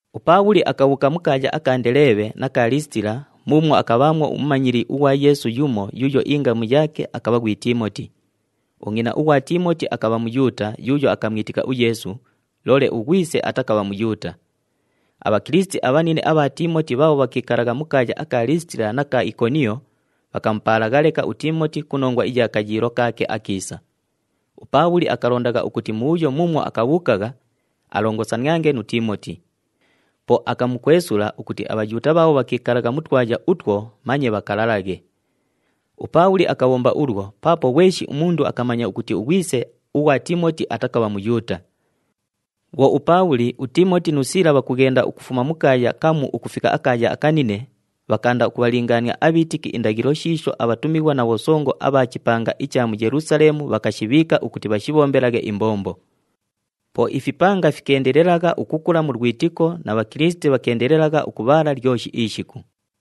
UPaabhuli akabhuuka mu kaaya aka Ndeleebhe na ka Liisitila muumwo akabhaamwo umumanyili ughwa Yeesu yumo yuuyo ingamu yaake akabha ghwi Tiimoti. Ungʼina ughwa Tiimoti akabha Muyuuta yuuyo akamwitika uYeesu, loole ughwise atakabha Muyuuta. ABhakilisiti abhanine abha Tiimoti bhaabho bhakiikalagha mu kaaya aka Liisitila na ka Ikoniyo bhakamupaalagha leka uTiimoti ku nongwa iya kayiilo kaake akiisa. UPaabhuli akalondagha ukuti mubhuyo muumwo akabhuukagha, alongosaniange nu Tiimoti. Po akamukwesula ukuti aBhayuuta bhaabho bhakiikalagha mu twaya utwo manye bhakalalaghe. UPaabhuli akabhomba ulwo paapo ghweshi umundu akamanya ukuti ughwise ughwa Tiimoti atakabha Muyuuta. Bhwo uPaabhuli, uTiimoti nu Siila bhakughenda ukufuma mu kaaya kamu ukufika akaaya akanine, bhakaanda ukubhalingaania abhiitiki indaghilo shiisho abhatumighwa na bhosongo abha chipanga icha mu Yelusaleemu bhakashibhiika ukuti bhashibhombelaghe imbombo. Po ifipanga fikeendelelagha ukukula mu lwitiko na Bhakilisiti bhakeendelelagha ukubhaala lyoshi ishiku.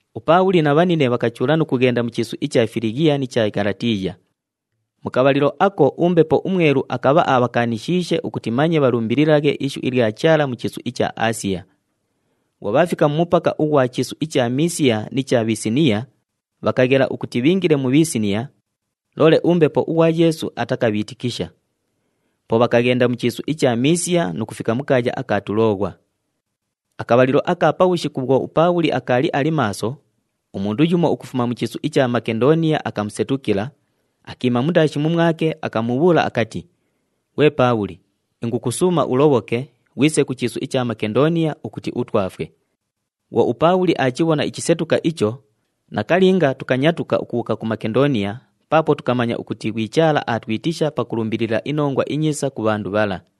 UPaabhuli na bhanine bhakachuula nu kughenda mu chiisu icha Filighiya ni cha Ghalatiiya. Mu kabhalilo ako uMbepo uMwelu akabha abhakaanishiishe ukuti manye bhalumbililaghe ishu ilya Chaala mu chiisu icha Aasiya. Bhwo bhaafika mu mupaka ughwa chiisu icha Miisiya ni cha Bhisiniiya, bhakaghela ukuti bhiingile mu Bhisiniiya, loole uMbepo ughwa Yeesu atakabhiitikisha. Po bhakaghenda mu chiisu icha Miisiya nu kufika mu kaaya aka Tulooghwa. Akabhalilo aka pabhushiku bhwo uPaabhuli akaali ali maaso, umundu yumo ukufuma mu chiisu icha Makendooniya akamusetukila, akiima mundaashi mumwake, akamubhuula akati, “Ghwe Paabhuli, ingukusuuma ulobhoke, ghwise ku chiisu icha Makendooniya ukuti utwafwe.” Bhwo uPaabhuli aachibhona ichisetuka icho, nakalinga tukanyatuka ukubhuuka ku Makendooniya paapo tukamanya ukuti ghwi Chaala aatwitisha pakulumbilila iNongwa iNyiisa ku bhandu bhala.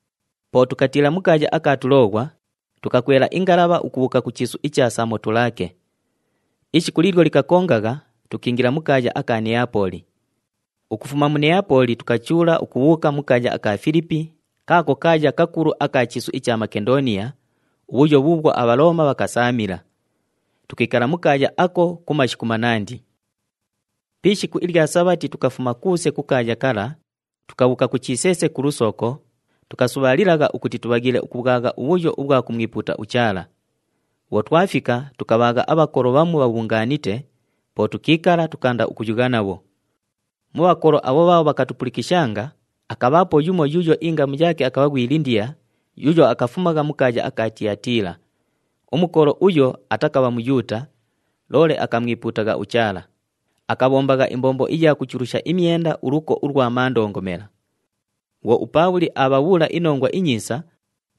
Po tukatiila mu kaaya aka Tulooghwa, tukakwela ingalabha ukubhuuka ku chiisu icha Samotulaake. Ishiku liilyo likakongagha, tukiingila mu kaaya aka Neyapooli. Ukufuma mu Neyapooli tukachuula ukubhuuka mu kaaya aka Filipi, kaako kaaya kakulu aka chiisu icha Makendooniya, ubhuyo bhuubhwo aBhalooma bhakasaamila. Tukiikala mu kaaya ako ku mashiku manandi. Pi ishiku ilya Sabhati tukafuma kuuse ku kaaya kala, tukabhuuka ku chiseese ku lusooko, tukasubhaalilagha ukuti tubhaghiile ukubhwagha ubhuyo ubhwa kumwipuuta uChaala. Bhwo twafika, tukabhaagha abhakolo bhamu bhabhungaanite, po tukiikala, tukaanda ukuyugha nabho. Mu bhakolo abho bhaabho bhakatupulikishanga, akabhaapo yumo yuuyo ingamu yaake akabha ghwi Lindiya yuuyo akafumagha mu kaaya aka Tiyatiila. Umukolo uyo atakabha Muyuuta, loole akamwipuutagha uChaala. Akabhombagha imbombo iya kuchulusha imyenda uluko ulwa mandongomela. Bhwo uPaabhuli aabhabhuula iNongwa iNyiisa,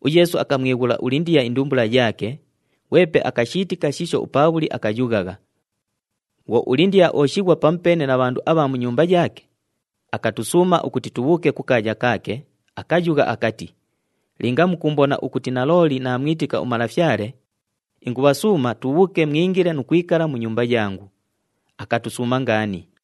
uYeesu akamwighula uLindiya indumbula yaake, ghwepe akashiitika shiisho uPaabhuli akayughagha. Bhwo uLindiya ooshighwa pamupeene na bhandu abha mu nyumba yaake, akatusuuma ukuti tubhuuke kukaaya kaake, akayugha akati, “Linga mukuumbona ukuti nalooli naamwitika uMalafyale, ingubhasuuma tubhuuke mwingile nu kwikala mu nyumba yangu.” Akatusuuma ngaani.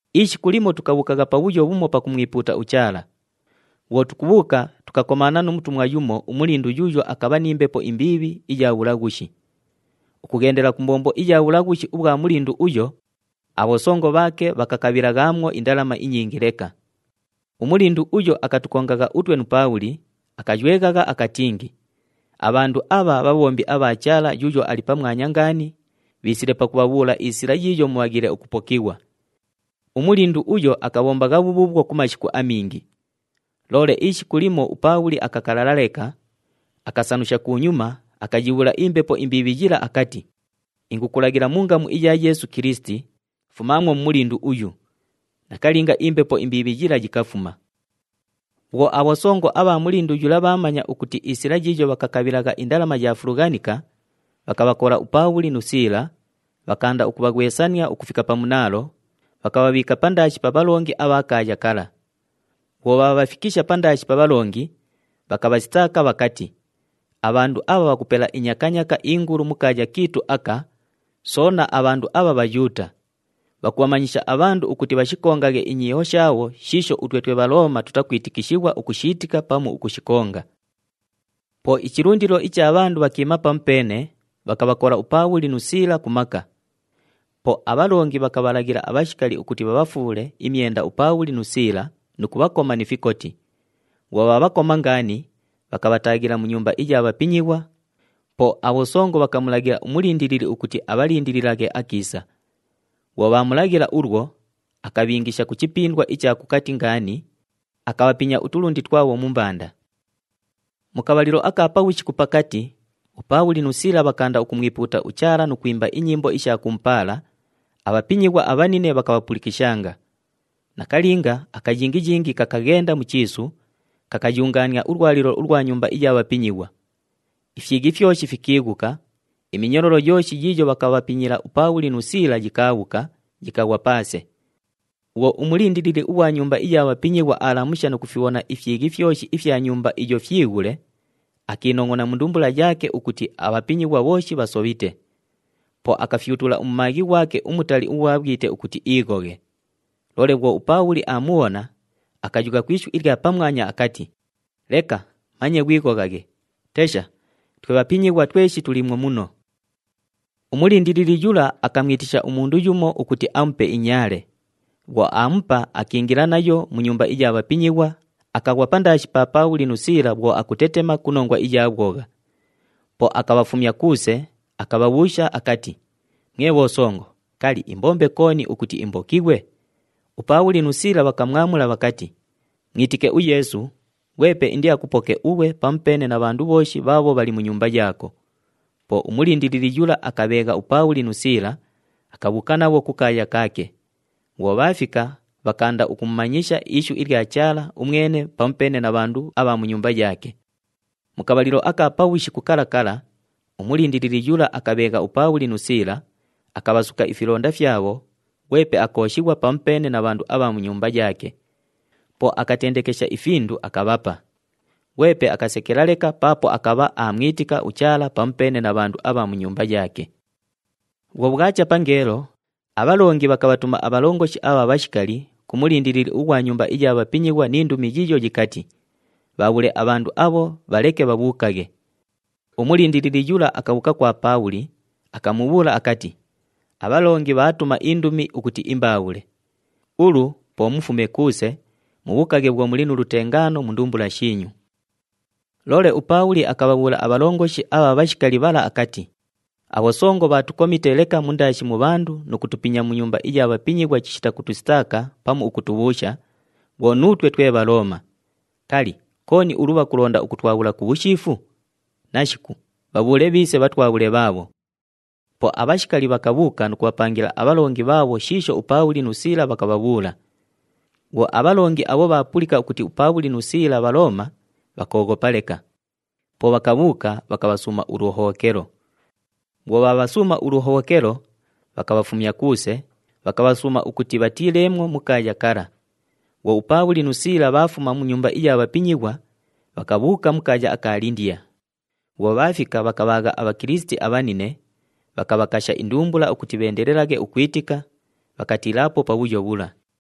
Ishiku limo tukabhuukagha pabhuyo bhumo pakumwipuuta uChaala. Bhwo tukubhuuka, tukakomaana nu mutumwa yumo umulindu yuuyo akabha ni mbepo imbiibhi iya bhulaghushi. Ukughendela ku mbombo iya bhulaghushi ubhwa mulindu uyo, abhosongo bhaake bhakakabhilaghaamwo indalama inyingi leka. Umulindu uyo akatukongagha utwe nu Paabhuli, akayweghagha akatingi, “Abhandu abha bhabhombi abha Chaala Yuuyo Ali Pamwanya Ngaani, bhiisile pakubhabhuula isila yiiyo mubhaghiile ukupokighwa!” Umulindu uyo akabhombagha bhubhuubhwo ku mashiku amingi. Loole ishiku limo uPaabhuli akakalala leka, akasanusha kunyuma, akayibhuula imbepo imbiibhi yila akati, “Ingukulaghila mu ngamu iya Yeesu Kilisiti, fumaamwo mu mulindu uyu!” Nakalinga, imbepo imbiibhi yila yikafuma. Bhwo abhosongo abha mulindu yula bhaamanya ukuti isila yiiyo bhakakabhilagha indalama yaafulughanika, bhakabhakola uPaabhuli nu Siila, bhakaanda ukubhaghwesania ukufika pa munaalo, bhakabhabhiika pandaashi pa bhalongi abha kaaya kala. Bhwo bhaabhafikisha pandaashi pa bhalongi, bhakabhasitaaka bhakati, “Abhandu abha bhakupela inyakanyaaka ingulu mu kaaya kiitu aka, soona abhandu abha Bhayuuta! Bhakubhamanyisha abhandu ukuti bhashikongaghe inyiiho shaabho shiisho utwe twe Bhalooma tutakwitikishighwa ukushiitika pamu ukushikonga.” Po ichilundilo icha bhandu bhakiima pamupeene, bhakabhakola uPaabhuli nu Siila ku maka. Po abhalongi bhakalaghila abhashikali ukuti bhabhafuule imyenda uPaabhuli nu Siila nu kubhakoma ni fikoti. Bhwo bhaabhakoma ngaani, bhakabhataaghila mu nyumba iya bhapinyighwa, po abhosongo bhakamulaghila umulindilili ukuti abhalindililaghe akiisa. Bhwo bhaamulaghila ulwo, akabhiingisha ku chipindwa icha kukati ngaani, akabhapinya utulundi twabho mu mbanda. Mu kabhalilo aka pabhushiku pakati, uPaabhuli nu Siila bhakaanda ukumwipuuta uChaala nu kwimba inyimbo isha kumupaala, abhapinyighwa abhanine bhakabhapulikishanga. Nakalinga, akayingiyingi kakaghenda mu chiisu, kakayungaania ulwalilo ulwa nyumba iya bhapinyighwa. Ifyighi fyoshi fikiighuka, iminyololo yooshi yiiyo bhakabhapinyila uPaabhuli nu Siila yikaabhuka, yikaghwa paase. Bhwo umulindilili ughwa nyumba iya bhapinyighwa aalamusha nu kufibhona ifyighi fyoshi ifya nyumba iyo fyighule, akiinongʼona mu ndumbula yaake ukuti abhapinyighwa bhooshi bhasobhite. Po akaghufyutula umumaaghi ghwake umutali ughwa bhwite ukuti iighoghe. Loole bhwo uPaabhuli aamubhona, akayugha ku ishu ilya pamwanya akati, “Leka, manye ghwighoghaghe, tesha twe bhapinyighwa tweshi tuliimwo muno!” Umulindilili yula akamwitisha umundu yumo ukuti amupe inyaale. Bhwo aamupa, akiingila nayo mu nyumba iya bhapinyighwa, akaghwa pandaashi pa Paabhuli nu Siila bhwo akutetema ku nongwa iya bhwogha. Po akabhafumya kuuse, akabhabhuusha akati, “Mwe bhosongo, kali, imbombe kooni ukuti imbokighwe?” UPaabhuli nu Siila bhakamwamula bhakati, “Mwitike uYeesu, ghwepe indiakupoke ughwe pamupeene na bhandu bhooshi bhaabho bhali mu nyumba yaako.” Po umulindilili yula akabheegha uPaabhuli nu Siila, akabhuuka nabho kukaaya kaake. Bhwo bhaafika, bhakaanda ukumumanyisha ishu ilya Chaala umwene pamupeene na bhandu abha mu nyumba yaake. Mu kabhalilo aka pabhushiku kala kala, umulindilili yula akabheegha uPaabhuli nu Siila, akabhasuka ifilonda fyabho, ghwepe akooshighwa pamupeene na bhandu abha mu nyumba yaake. Po akatendekesha ifindu, akabhapa. Ghwepe akasekela leka paapo akabha aamwitika uChaala pamupeene na bhandu abha mu nyumba yaake. Bhwo bhwacha pangeelo, abhalongi bhakabhatuma abhalongoshi abha bhashikali ku mulindilili ughwa nyumba iya bhapinyighwa ni ndumi yiiyo yikati, “Bhaabhule abhandu abho, bhaleke bhabhuukaghe.” Umulindilili yula akabhuuka kwa Paabhuli, akamubhuula akati, “Abhalongi bhaatuma indumi ukuti imbaabhule. Ulu po mufume kuuse, mubhuukaghe bhwo muli nu lutengaano mu ndumbula shiinyu.” Loole uPaabhuli akabhabhuula abhalongoshi abha bhashikali bhala akati, “Abhosongo bhaatukomite leka mundaashi mu bhandu nu kutupinya mu nyumba iya bhapinyighwa chishita kutusitaaka pamu ukutubhuusha, bhwo nuutwe twe Bhalooma. Kali, kooni ulu bhakulonda ukutwabhula ku bhushiifu? Nashiku, bhabhuule bhiise bhatwabhule bhaabho.” Po abhashikali bhakabhuuka nu kubhapangila abhalongi bhaabho shiisho uPaabhuli nu Siila bhakabhabhuula. Bhwo abhalongi abho bhaapulika ukuti uPaabhuli nu Siila Bhalooma, bhakooghopa leka. Po bhakabhuuka, bhakabhasuuma uluhobhokelo. Bhwo bhaabhasuuma uluhobhokelo, bhakabhafumya kuuse, bhakabhasuuma ukuti bhatiileemwo mu kaaya kala. Bhwo uPaabhuli nu Siila bhaafuma mu nyumba iya bhapinyighwa, bhakabhuuka mu kaaya aka Lindiya. Bhwo bhaafika, bhakabhaagha aBhakilisiti abhanine, bhakabhakasha indumbula ukuti bheendelelaghe ukwitika, bhakatiilaapo pabhuyo bhula.